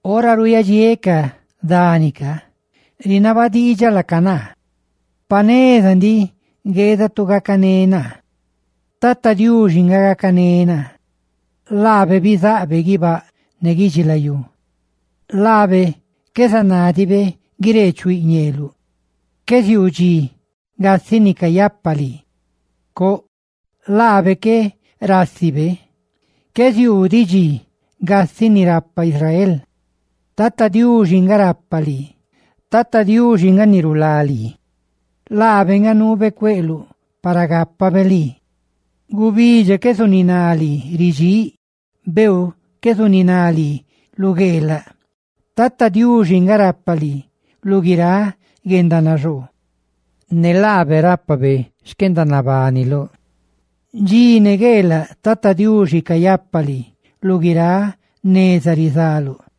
Ora ruuyadxiéꞌ ca dani rinaba diidxaꞌ laca naa: «Pa neza ndiꞌ gueeda tu gacané naa.» Tata Diuxi nga gacané naa, ni bizáꞌ guibáꞌ ne guidxilayú. ¡Laabe qué zanádibe guireechuiꞌ ñeeluꞌ! ¡Qué ziuu dxi gasiꞌ ni cayapa lii! Coꞌ, laabe qué rásibe; qué ziuu diꞌ dxi gasiꞌ ni rapa Israel. Tata Diuxi nga rapa lii; Tata Diuxi nga ni rulá lii, laabe nga nuube cueꞌluꞌ para gacanebe lii. Gubidxa qué zuniná lii ridxíꞌ, beeu qué zuniná lii lu gueelaꞌ. Tata Diuxi nga rapa lii lu guiráꞌ guendanaxoo; ne laabe rápabe xquendanabaniluꞌ. Dxi ne gueelaꞌ Tata Diuxi cayapa lii, lu guiráꞌ neza rizaluꞌ.